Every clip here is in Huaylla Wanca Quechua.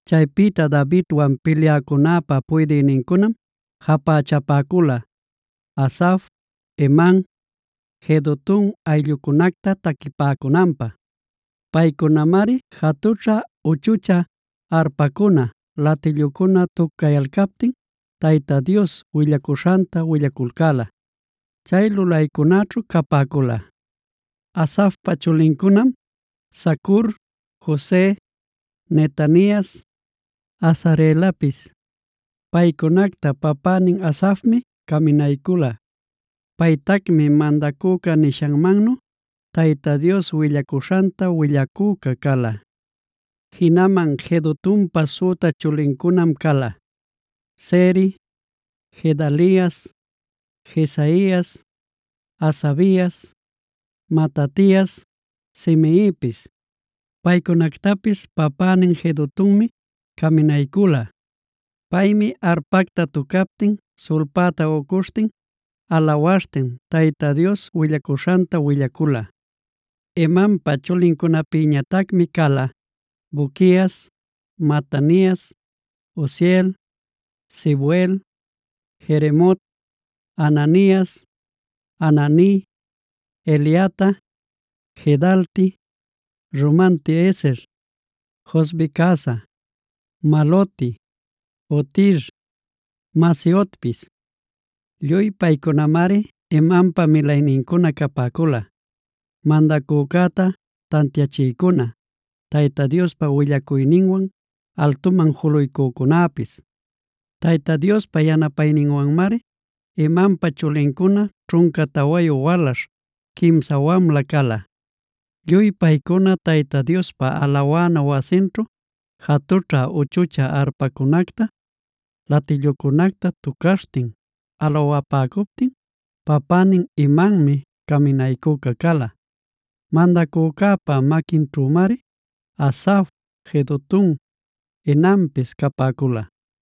Chaypïta Davidwan pilyäcunäpa puydïnincunam japächapäcula, Asaf, Heman, Jedutun ayllucunacta taquipäcunanpä. Paycunamari jatućhä-uchuchä arpacuna, latillucuna tucayalcaptin Tayta Dios willacuśhanta willaculcäla. Chay lulaycunaćhu capäcula: Asafpa chulincunam: Zacur, Jose, Netanias, Asarelapis. Paycunacta papänin Asafmi caminaycula. Paytacmi mandacüca nishanmannu Tayta Dios willacuśhanta willacüca cala. Jinaman Jedutunpa süta chulincunam cala: Zeri, Gedalias, Jesaias, Hasabias, Matatias, Simeipis. Paycunactapis papänin Jedutunmi caminaycula. Paymi arpacta tucaptin sulpäta ucuśhtin, alawaśhtin Tayta Dios willacuśhanta willacula. Hemanpa chulincunapïñatacmi cala: Buquias, Matanias, Uziel, Sebuel, Jeremot, Hananias, Hanani, Eliata, Gidalti, Romanti-ezer, Josbecasa, Maloti, Hotir, Mahaziotpis. Lluy paycunamari Hemanpa milaynincuna capäcula, mandacücäta tantiachïcuna, Tayta Diospa willacuyninwan altuman juluycücunapis. Tayta Diospa yanapayninwanmari Hemanpa chulincuna ćhunca tawayu walaśh, quimsa wamla cala. Lluy paycuna Tayta Diospa alawana wasinćhu jatućha-uchuchä arpacunacta, latillucunacta tucaśhtin alawapäcuptin, papänin Hemanmi caminaycüca cala. Mandacücäpa maquinćhümari Asaf, Jedutun, Hemanpis capäcula.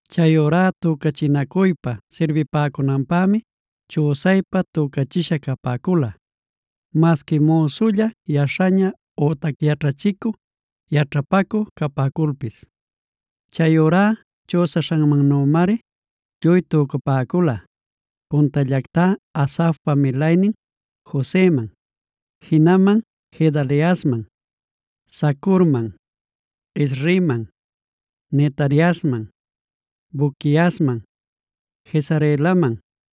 Chayurá tücachinacuypa sirbipäcunanpämi chüsaypa tücachisha capäcula, masqui müsulla yaśhaña ütac yaćhachicü yaćhapacü capäculpis. Chayurá chüsaśhanmannümari lluy tücapäcula: puntallactá Asafpa milaynin Joseman, jinaman Gedaliasman, Zacurman, Izriman, Netaniasman, Buquiasman, Jesarelaman,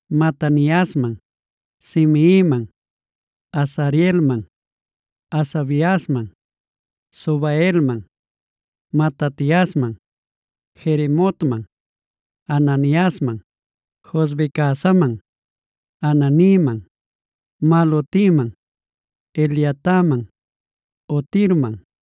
Mataniasman, Simeiman, Azareelman, Hasabiasman, Subaelman, Matatiasman, Jeremotman, Hananiasman, Josbecasaman, Hananiman, Malotiman, Eliataman, Hotirman,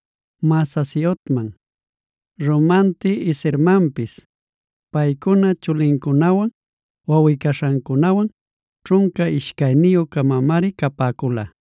Mahaziotman, Romanti-ezermanpis. Paycuna chulincunawan wawꞌi-caśhancunawan ćhunca ishcayniyü-camamari capäcula.